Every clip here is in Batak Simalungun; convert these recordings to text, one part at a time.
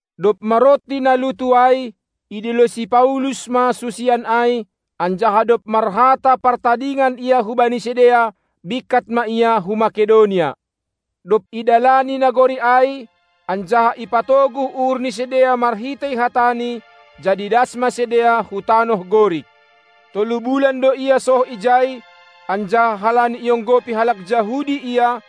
Dob maronti na lutu ai, idilo si Paulus ma susian ai, anjaha dob marhata partadingan ia hubani sidea, bingkat ma ia hu Makedonia. Dob idalani nagori ai, anjaha ipatoguh uhur ni sidea marhitei hatani, jadi das ma sidea hu tanoh Gorik. Tolu bulan do ia soh ijai, anjaha halani ionggopi halak Jahudi ia,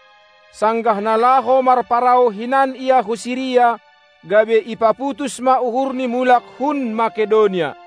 sanggah na laho marparau hinan ia hu Siria, gabe ipaputus ma uhurni mulak hun Makedonia.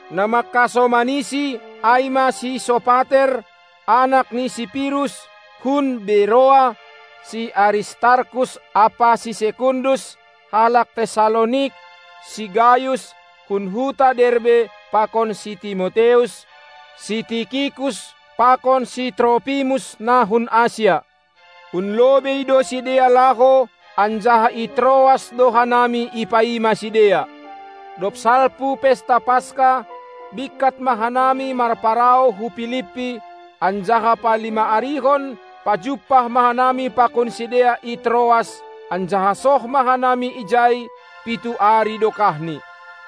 Na mangkasomanisi ai ma si Sopater, anak ni si Pirus, hun Beroa, si Aristarkus ampa si Sekundus, halak Tessalonik, si Gayus, hun huta Derbe pakon si Timoteus, si Tikikus, pakon si Tropimus na hun Asia. Hun lobei do sidea laho, anjaha i Troas do hanami ipaima sidea. Dob salpu pesta Paska, bingkat ma hanami marparau hu Pilipi, anjaha palima-arihon pajumpah ma hanami pakon sidea i Troas, anjaha soh ma hanami ijai pitu ari dokahni.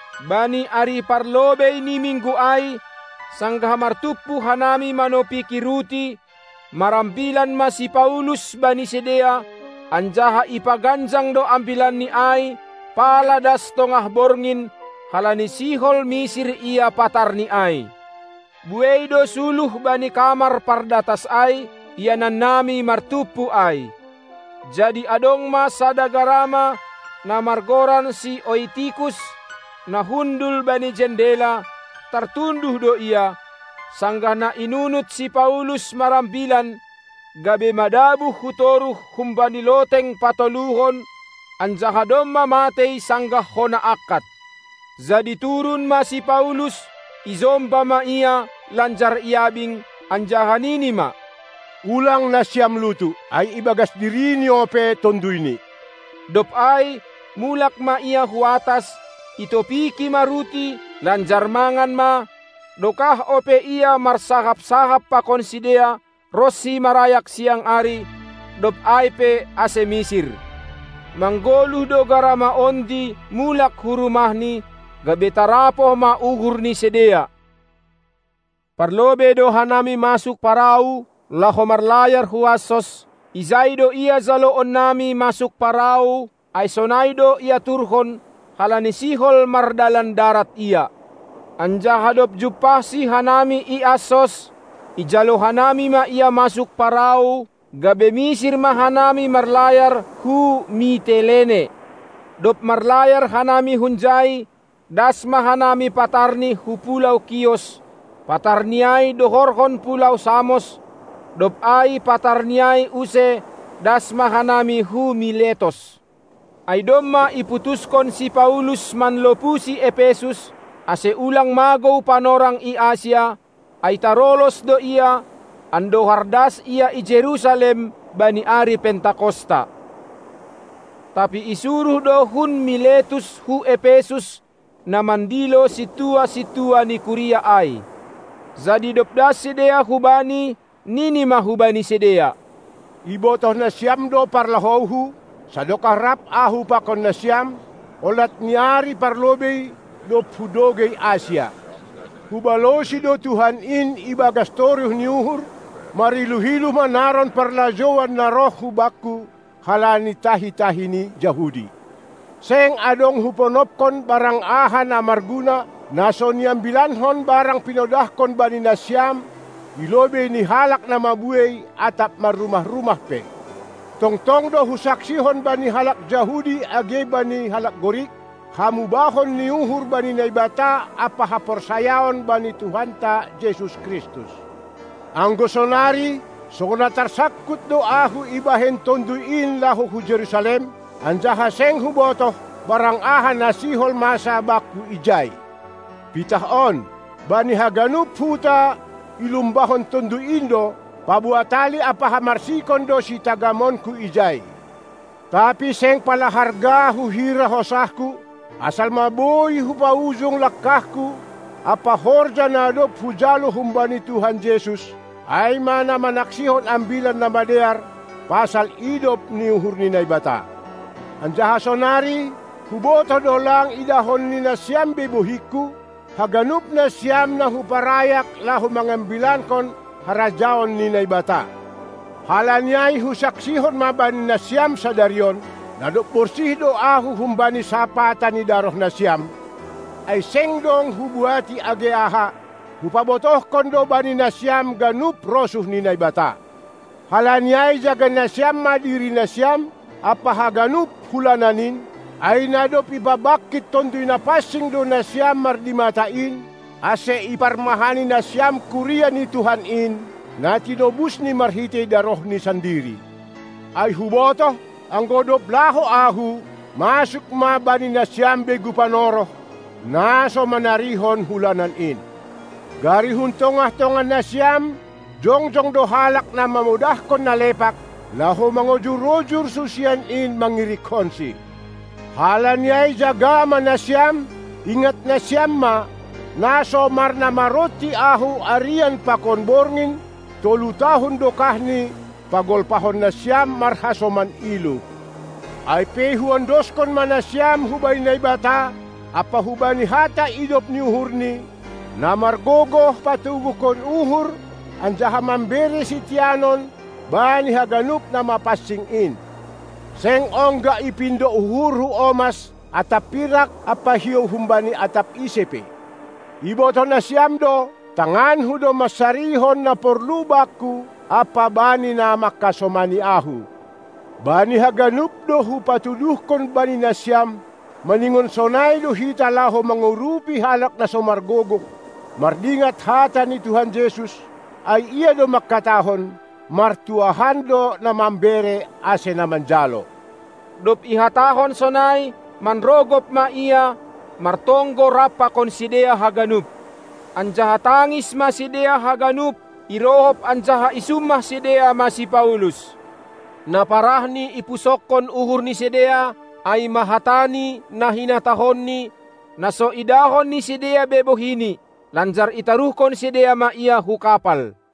Bani ari parlobei ni minggu ai, sanggah martumpu hanami manopiki ruti, marambilan ma si Paulus bani sidea anjaha ipaganjang do ambilanni ai pala das tongah borngin halani sihol misir ia patarni ai. Buei do suluh bani kamar pardatas ai, ianannami martumpu ai. Jadi adong ma sada garama, na margoran si Oitikus, na hundul bani jandela; tartunduh do ia, sanggah na inunut si Paulus marambilan, gabe madabuh hu toruh humbani loteng patoluhon, anjaha domma matei sanggah hona angkat. Jadi turun ma si Paulus, ijomba ma ia lanjar iabing, anjaha nini ma: Ulang nasiam lutu, ai ibagas dirini ope tonduyni! Dob ai mulak ma ia hu atas, itopiki ma ruti, lanjar mangan ma; dokah ope ia marsahap-sahap pakon sidea, ronsi marayak siang ari, dob ai pe ase misir. Manggoluh do garama ondi mulak hu rumahni, gabe tarapoh ma uhur ni sidea. Parlobei do hanami masuk parau laho marlayar hu Assos, ijai do ia jaloon nami masuk parau; ai sonai do iaturhon, halani sihol mardalan darat ia. Anjaha dob jumpahsi hanami i Assos, ijalo hanami ma ia masuk parau, gabe misir ma hanami marlayar hu Mitelene. Dob marlayar hanami hunjai, das ma hanami patarni hu pulou Kios, patarni ai dohorhon pulou Samos, dob ai patarni ai use das ma hanami hu Miletos. Ai domma iputuskon si Paulus manlopusi Epesus, ase ulang magou panorang i Asia, ai tarolos do ia, andohar das ia i Jerusalem bani ari Pentakosta. Tapi isuruh do hun Miletus hu Epesus na mandilo sintua-sintua ni kuria ai. Jadi dob das sidea hubani, nini ma hubani sidea: Ibotoh nasiam do parlahouhu, sadokah rap ahu pakon nasiam, olat ni ari parlobei, dob hudogei Asia. Hubalosi do Tuhan in ibagas toruh ni uhur, mariluh-iluh manaron parlajouan na roh hubakku halani tahi-tahi ni Jahudi. Seng adong huponopkon barang aha na marguna, na so niambilankon barang pinodahkon bani nasiam i lobei ni halak na mabuei atap marrumah-rumah pe. Tongtong do husaksihon bani halak Jahudi age bani halak Gorik, hamubahon ni uhur bani Naibata ampa haporsayaon bani Tuhanta Jesus Kristus. Anggo sonari, songon na tarsangkut do ahu ibahen Tonduy in laho hu Jerusalem, anjaha seng hubotoh, barang aha na sihol masa bakku ijai. Pitah on: Bani haganup huta ilumbahon Tonduy in do, paboa tali ampa hamarsikon do sitagamonku ijai. Tapi seng pala harga huhira hosahku, asal ma boi hupaujung langkahku ampa horja na dob hujalo humbani Tuhan Jesus, ai ma na manaksihon Ambilan Namadear pasal idop ni uhur ni Naibata. Anjaha sonari, hubotoh do lang idahon ni nasiam be bohingku, haganup nasiam na huparayak laho mangambilankon harajaon ni Naibata. Halani ai husaksihon ma bani nasiam sadari on, na dob borsih do ahu humbani sapata ni darohnasiam, ai seng dong hubuati age aha, hupabotohkon do bani nasiam ganup rosuh ni Naibata. Halani ai jaga nasiam ma dirinasiam ampa haganup hulanan in, ai na dob ipabangkit Tonduy Napansing do nasiam mardimata in, ase iparmahani nasiam kuria ni Tuhan in, na tinobusni marhitei darohni sandiri. Ai hubotoh, anggo dob laho ahu, masuk ma bani nasiam begu panoroh, na so manarihon hulanan in. Gari hun tongah-tongah nasiam jongjong do halak na mamodahkon na lepak, laho mangojur-ojur susian in mangirikkonsi. Halani ai jaga ma nasiam, ingat nasiam ma, na so marnamaronti ahu arian pakon borngin tolu tahun dokahni pagolpahon nasiam marhasoman iluh. Ai pe huondoskon ma nasiam hubani Naibata ampa hubani hata idop ni uhurNi, na margogoh patoguhkon uhur anjaha mambere siteanon bani haganup na mapansing in. Seng ongga ipindo uhurhu omas atap pirak ampa hiou humbani atap ise pe. Ibotoh nasiam do, tanganku do mansarihon na porlu bakku ampa bani na mangkasomani ahu. Bani haganup do hupatuduhkon bani nasiam, maningon sonai do hita laho mangurupi halak na so margogoh, mardingat hata ni Tuhan Jesus, ai Ia do mangkatahon: Martuahan do na mambere ase na manjalo. Dob ihatahon sonai, manrogop ma ia martonggo rap pakon sidea haganup. Anjaha tangis ma sidea haganup, irohop anjaha isummah sidea ma si Paulus. Na parahni ipusokkon uhur ni sidea, ai ma hatani na hinatahonni, na so idahon ni sidea be bohini. Lanjar itaruhkon sidea ma ia hu kapal.